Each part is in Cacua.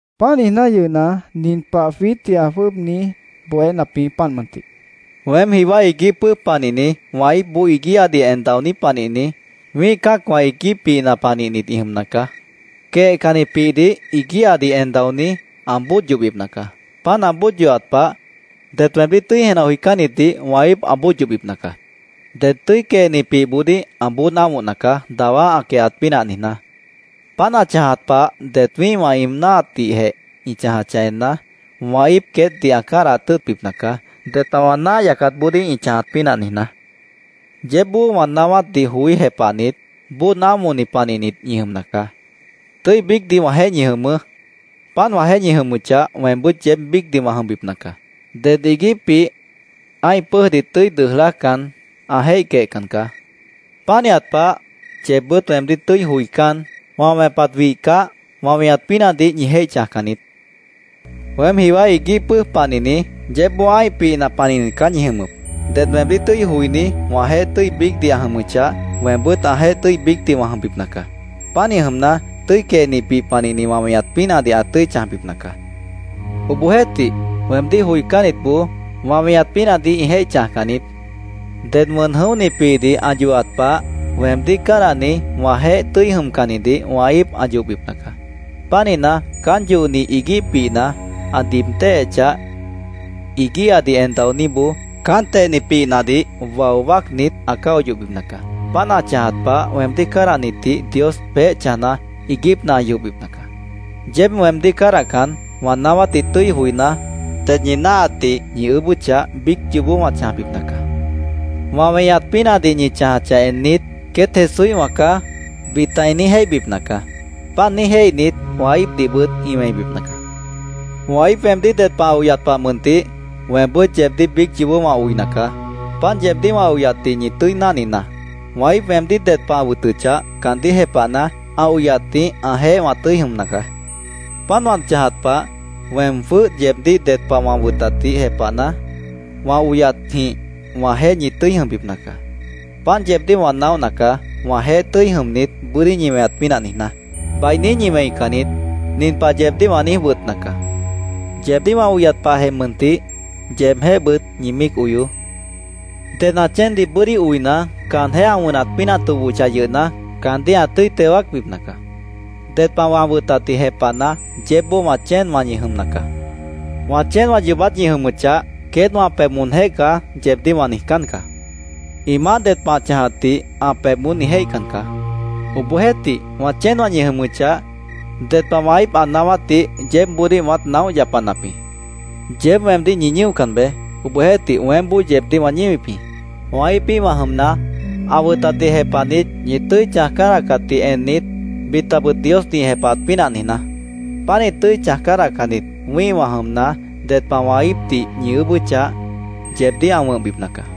Páant niijná yʉhna, nin pah jwiítdih ã jwʉ́ʉb niíj bohénap jĩ, páant mʉntih: “Weém jiwá iguíh pʉ́ʉj panihni, wã íipboó iguíhadih en daoní panihni, wĩ́ih cã́acwã iguíh pihna panihnit ĩ jʉmna caá. Quehcanni pihdih iguíhadih en daoní ã bóod yohbipna caá. Páant ã bóod yohat pah, det weemdíh tʉ́i jenah joicánnitdih wã íip ã yohbipna caá. Ded tʉ́i quehni pihboodíh ã bóod ámohna caá, dawá ã quehat pínah niijná. Páant ã chãjat pah det wĩ́ihwã ĩ náahatdihjeh ĩ chãjachah enna, wã íip queétdih ã cádahat tʉ́ʉtbipna caá, ded pah wã náah yacatboodíh ĩ chãjat pínah niijná. Yeébboó wã naáwátdih joí jepahnit, bóod ámohni panihnit ñi jʉmna caá. Tʉ́i biícdih wãjeéh ñi jʉmʉʉ́. Páant wãjeéh ñi jʉmʉchah, weembʉ́t yeéb biícdih wã jʉmbipna caá. Ded iguíh pih ã́ih pʉ́ʉjdih tʉ́i dʉʉj lájcan, ã jéih quehcan caá. Pánihat pah, yeebbʉ́t weemdíh tʉ́i joicán, wã wẽpat ã wihcah, wã weñat pínahdih ñi jéih chãjcan niít. “Weém jiwá iguíh pʉ́ʉj panihni, yeébboó ã́ih pihna panihnit caá ñi jʉmʉp. Ded weemdíh tʉ́i joiní wãjeéh tʉ́i biícdih ã jʉmʉchah, weembʉ́t ãjeéh tʉ́i biícdih wã jʉmbipna caá. Pánih jʉmna, tʉ́i quehni pih panihni wã weñat pínahdih ã tʉ́i chãjbipna caá. Obohjeéhtih, weemdíh joicánnitboó, wã weñat pínahdih ĩ jéih chãjcan niít. Ded wʉn jʉ̃óhni pihdih ã yohat pah, weemdíh cádahni, wãjeéh tʉ́i jʉmcannidih wã íip ã yohbipna caá. Pánihna, caán yohni iguíh pihna ã diib téhechah, iguíhadih en daoníboó caán tehni pihnadih wao wáacnit, ã cáo yohbipna caá. Páant ã chãjat pah, weemdíh cádahnitdih Dios peéh chãjna, iiguípna ã yohbipna caá. “Yeéb weemdíh cádahcan, wã naáwátdih tʉ́i joiná, ded ñi náahatdih ñi ʉʉ́bʉ́chah, biíc yoobó wã chãjbipna caá. Wã weñat pínahdih ñi chãjachah ennit, ‘Queét Jesúíhwã caá’, bita ĩ niíj jéihbipna caá. Páant niíj jéihnit, wã íipdihbʉt ĩ wẽibipna caá. Wã íip weemdíh ded pah ã oyat pah mʉntih weembʉ́t yeebdíh biíc yoobó wã oina caá. Páant yeebdíh wã oyatdih ñi tʉ́i náhninaá. Wã íip weemdíh ded pah ã wʉtʉchah, caandíh jepahna, ã oyatjĩh ãjeéh wã tʉ́i jʉmna caá. Páant wã chãjat pah, weem jwʉ́h yeebdíh ded pah wã wʉtatdih jepahna, wã oyatjĩh wãjeéh ñi tʉ́i jʉmbipna caá. “Páant yeebdíh wã naóhna caá, wãjeéh tʉ́i jʉmnit, bʉ́dí ñi weñat pínah niijná. Bainí ñi wẽican niít. Nin pah yeebdíh wã niíj wʉtna caá: Yeebdíh wã oyat pahjeh mʉntih, yeebjéhbʉt ñi míic oyoó. Ded ã chéendih bʉ́dí oina, caanjéh ã wʉnat pínah tobohochah yʉhna, caandíh ã tʉ́i teo wáacbipna caá. Ded pah wã wʉtatdih jepahna, yeébboó wã chéenwã ñi jʉmna caá. Wã chéenwã yoobát ñi jʉmʉchah, ‘queét wã pebh moonjéh caá’, yeebdíh wã niijcán caá. Ĩ maáh ded pah ã chãjatdih ã pebh moón ĩ jéihcan caá. Obohjeéhtih, wã chéenwã ñi jʉmʉchah, ded pah wã íip ã naáwátdih yeébboodíh wãát naóh yapanap jĩ. Yeéb weemdíh ñi ñíocan beé. Obohjeéhtih, weémboó yeebdíh wã ñíwip jĩ, wã íipíhwã jʉmna, ã wʉtatdih jepahnit, ñi tʉ́i chãj cádahcatdih ennit, bitabʉt Diosdih ĩ jepahat pínah niijná. Pánih tʉ́i chãj cádahcannit, wĩ́ihwã jʉmna, ded pah wã íipdih ñi ʉʉ́bʉ́chah, yeebdíh ã wʉ̃hbipna caá.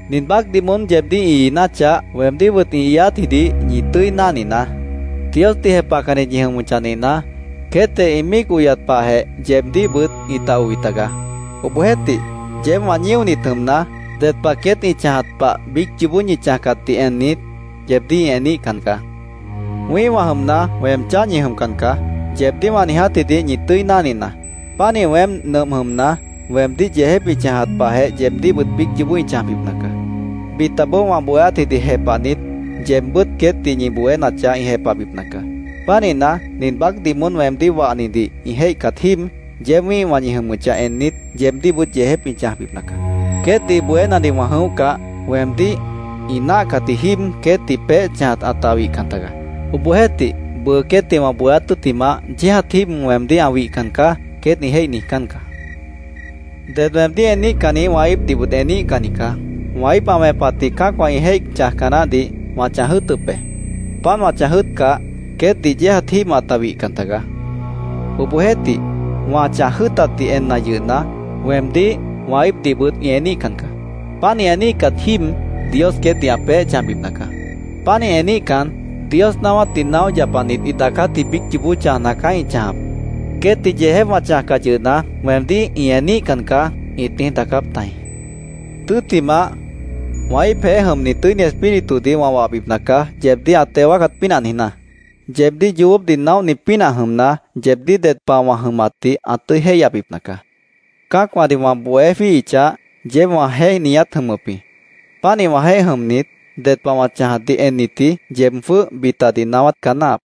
“Nin baácdih moón yeebdíh ĩ iináchah, weemdíhbʉt ĩ iiátjidih ñi tʉ́i náhninaá. Diosdih jepahcannit ñi jʉmʉchah nihna, queétjeh ĩ míic oyat pahjeh, yeebdíhbʉt ĩta oi tagaá. Obohjeéhtih, yeéb wã ñíonit jʉmna, ded pah queét ĩ chãjat pah biíc yoobó ñi chãjcatdih ennit, yeebdíh ĩ eníhcan caá. ‘Wĩ́ihwã jʉmna, weem cháh ñi jʉmcan caá’, yeebdíh wã niijátjidih ñi tʉ́i náhninaá. Pánih weém nʉmp jʉmna, weemdíh yeejép ĩ chãjat pahjeh yeebdíhbʉt biíc yoobó ĩ chãjbipna caá. Bitaboó wã bohéátdih jepahnit, yeebbʉ́t queétdih ñi bohénachah, ĩ jepahbipna caá. Pánihna, nin baácdih moón weemdíh wahnidih ĩ jéihcat jíib, yeéb wĩ́ihwã ñi jʉmʉchah ennit, yeebdíhbʉt yeejép ĩ chãjbipna caá. “Queétdih bohénadih wã jʉ̃óhcah, weemdíh ĩ náahcatji jíib queétdih peéh chãjat ãta wihcan tagaá. Obohjeéhtih, bʉʉ queétdih wã bohéát tʉ́ttimah, ‘Yéejat jíib weemdíh ã wihcan caá’, queét ĩ jéih niijcán caá. Ded weemdíh eníhcanni wã íipdihbʉt eníhcanni caá. Wã íip ã wẽpatjĩh cã́acwã ĩ jéih chãjca naáhdih wã chãj jʉ́ʉtʉp be. Páant wã chãj jʉ́ʉtcah, queétdih yéejat jíib ãta wihcan tagaá. Obohjeéhtih, wã chãj jʉ́ʉtatdih enna yʉhna, weemdíh, wã íipdihbʉt ĩ eníhcan caá. Páant ĩ eníhcat jíib, Dios queétdih ã peéh chãjbipna caá. Pánih eníhcan, Dios naáwátdih naóh yapanit ĩ daacátji biíc yoobó chãjna caá ĩ chãjap. ‘Queétdih yeejép wã chãjcah yʉhna, weemdíh ĩ eníhcan caá’, ĩt niíj daacáp tajĩ. “Tʉ́ttimah, wã íipjeéh jʉmni Tʉ́ini Espíritudih wã wahbipna caá, yeebdíh ã teo wáacat pínah niijná. Yeebdíh yoobópdih naóhni pínah jʉmna, yeebdíh ded pah wã jʉmatdih ã tʉ́i jéihyabipna caá. Cã́acwãdih wã bohé jwíihichah, yeéb wãjeéh ñiát jʉmʉp jĩ. Pánih wãjeéh jʉmnit, ded pah wã chãjatdih ennitji yeeb jwʉ́h bitadih naáwát caá náahap.